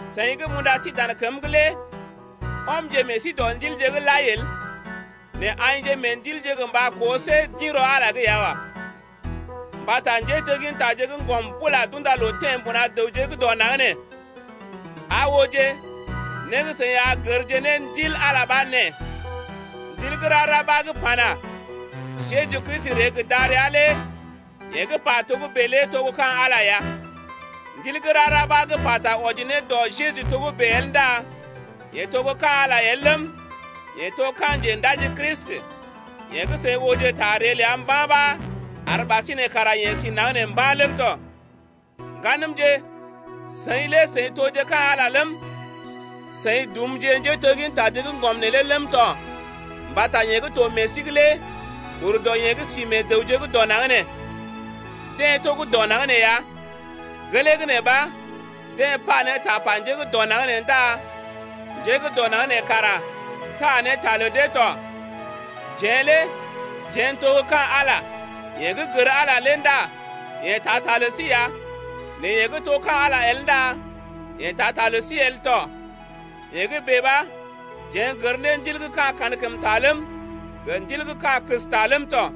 Seḭ gə́ m’unda sí dan kəm’g lé ɔmje meḛ sí dɔ ndilje’g lai el, nɛ aḭje meḛ ndilje gə mba koo see d’ḭ rɔ Ala’g ya wa. Mbata njéteggintaje gə́ ŋgɔm bula d’unda loo teḛ mbuna dəwje’g dɔ naŋg nee. Aa ooje, né gə́ seḭ a gərje ne Ndil Ala lé ɓa nee: Ndil gə́ rara ɓa gə́ pana: Jeju Kristi ree gə́ darəa lé yeḛ gə́ pa togə́bè lé to gə́ ka̰ Ala ya. Ndil gə́ rara ɓa gə́ pata wɔji ne dɔ Jeju togə́bè el ndá yeḛ to gə́ ka̰ Ala el ləm, yeḛ to ka̰ Njendaji Kristi, yeḛ gə́ seḭ ooje ta ree ləa mba̰ ɓa ar ɓasinè kara yeḛ si naŋg nee mba̰ ləm tɔ. Ŋganəmje, seḭ lé seḭ toje ka̰ Ala ləm, seḭ dumje njéteggintaje gə́ ŋgɔm neelé ləm tɔ mbata yeḛ gə́ to meḛ sí’g lé ur dɔ yeḛ gə́ sí meḛ dəwje gə́ dɔ naŋg nee. Deḛ to gə́ dɔ naŋg nee ya, gelee gə́ nee ɓa, deḛ pa ne tapa njé gə́ dɔ naŋg nee ndá njé gə́ dɔ naŋg nee kara taa ne ta lə dee tɔ. Jeḛ lé jeḛ n’to gə́ ka̰ Ala, yeḛ gə́ gər Ala lé ndá yeḛ taa ta lə sí ya, nɛ yeḛ gə́ to gə́ ka̰ Ala el ndá yeḛ taa ta lə sí el tɔ. Yee gə́ bèe ɓa jeḛ n’gər ne ndil gə́ ka̰ kankəmta ləm, gə ndil gə́ ka̰ kəsta ləm tɔ.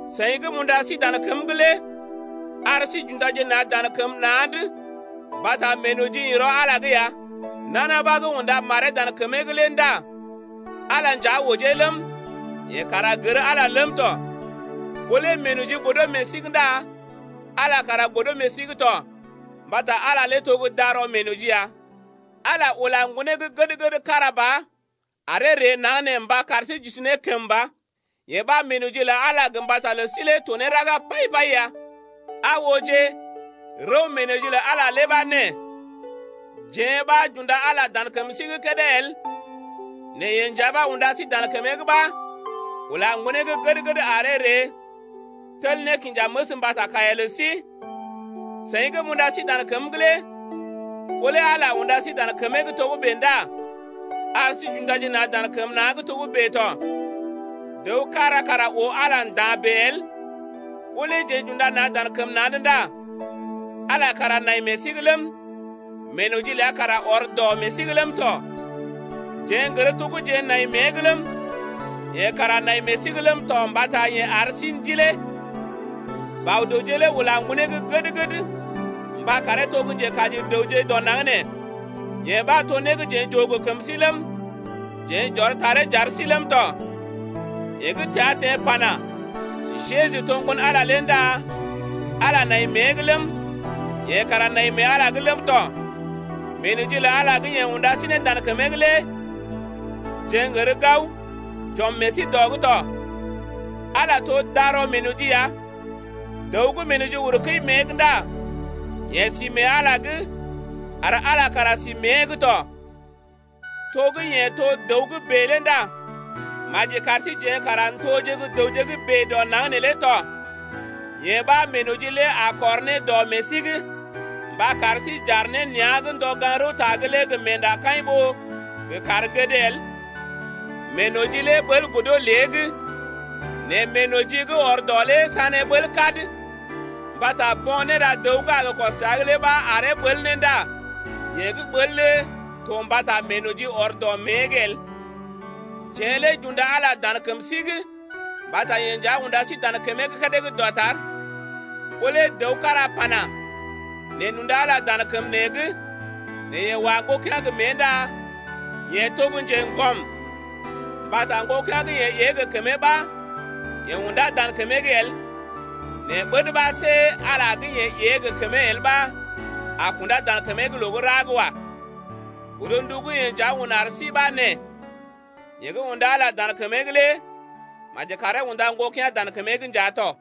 Seḭ gə́ m’unda sí dan kəm’g lé ar sí j’undaje na̰ dan kəm na̰’d mbata meenoji ḭ rɔ Ala’g ya. Nana ɓa gə́ unda maree dan kəmee’g lé ndá Ala nja ojee ləm, yeḛ kara gər Ala ləm tɔ. Ɓó lé meenoji godo meḛ sí’g ndá Ala lé kara godo meḛ sí’g to mbata Ala to gə́ darɔ meenoji ya. Ala ula Ŋgonee gə́ gəd-gəd kára ba aree ree naŋg nee mba kar sí j’isi ne kəmba, yee ɓa meenoji lə Ala gə mbata lə sí lé to ne raga pai-pai ya. Aa ooje, rəw meenoji lə Ala lé ɓa nee: Jeḛ ɓa j’unda Ala dan kəm sí’g kédé el nɛ yeḛ nja ɓa unda sí dan kəmee’g ɓa ula Ŋgonee gə́ gəd-gəd aree ree tel nékinjaməs mbata kaiya lə sí ya. Seḭ gə́ m’unda sí dan kəm’g lé ɓó lé Ala unda sí dan kəmee’g togə́bè ndá ar sí j’undaje na̰ dan kəm na̰’d togə́bè tɔ. Dəw kára kara oo Ala nda̰ bèe el, ɓó lé jeḛ j’unda na̰ dan kəm na̰’d ndá Ala kara nai meḛ sí’g ləm, meenoji ləa kara ɔr dɔ meḛ sí’g ləm tɔ. Jeḛ n’gər to gə́ jeḛ nai mée’g ləm, yeḛ kara nai meḛ sí’g ləm tɔ mbata yeḛ ar sí Ndilee. Bɔ-dəwje lé ula Ŋgonee gə́ gəd-gəd mba karee to gə́ Njekaji dəwje dɔ naŋg nee, yee ɓa to né gə́ jeḛ j’oo gə kəm sí ləm, jeḛ j’ɔr taree j’ar sí ləm tɔ. Yeḛ gə́ təa teḛ pana: Jeju to Ŋgon-Ala lé ndá Ala nai mée’g ləm, yeḛ kara nai mee Ala’g ləm tɔ. Meenoji lə Ala gə́ yeḛ unda sí ne dan kəmee’g lé jeḛ n’gər gao j’ɔm meḛ sí dɔ’g tɔ. Ala to darɔ meenoji ya, dəw gə́ meenoji uru kəi mée’g ndá yeḛ si mee Ala’g ar Ala kara si mée’g tɔ. To gə́ yeḛ to dəw gə́ bèe lé ndá maji kar síjeḛ kara n’toje gə́ dəwje gə́ bèe dɔ naŋg neelé tɔ, yee ɓa meenoji lé a kɔr ne dɔ meḛ sí’g mba kar sí j’aar ne nea̰’g ndɔ gaŋg-rəwta’g lé gə meendakaḭ ɓó gə kaar gəd el. Meenoji lé ɓəl godo lée’g nɛ meenoji gə́ ɔr dɔ lé sané ɓəl kad. Mbata bo̰ néra dəw gə́ a gə kɔs təa’g lé ɓa aree ɓəl ne ndá yeḛ gə́ ɓəl lé to mbata meenoji ɔr dɔ mée’g el. Jeḛ lé j’unda Ala dan kəm sí’g mbata yeḛ nja unda sí dan kəmee’g kédé gə́ dɔtar. Ɓó lé dəw kára pana: Neḛ n’unda Ala dan kəm neḛ’g, nɛ yeḛ wa ŋgokea̰ gə mée ndá yeḛ to gə́ njeŋgɔm. Mbata ŋgokea̰ gə́ yeḛ ée gə kəmee ɓa yeḛ unda dan kəmee’g el, nɛ ɓəd ɓa see Ala gə́ yeḛ ée gə kəmee el ɓa a kundá dan kəmee’g loo gə́ ra’g wa. Godndu gə́ yeḛ nja un ar sí ɓa nee: Yeḛ gə́ unda Ala dan kəmee’g lé maji karee unda ŋgokea̰ dan kəmee’g nja tɔ.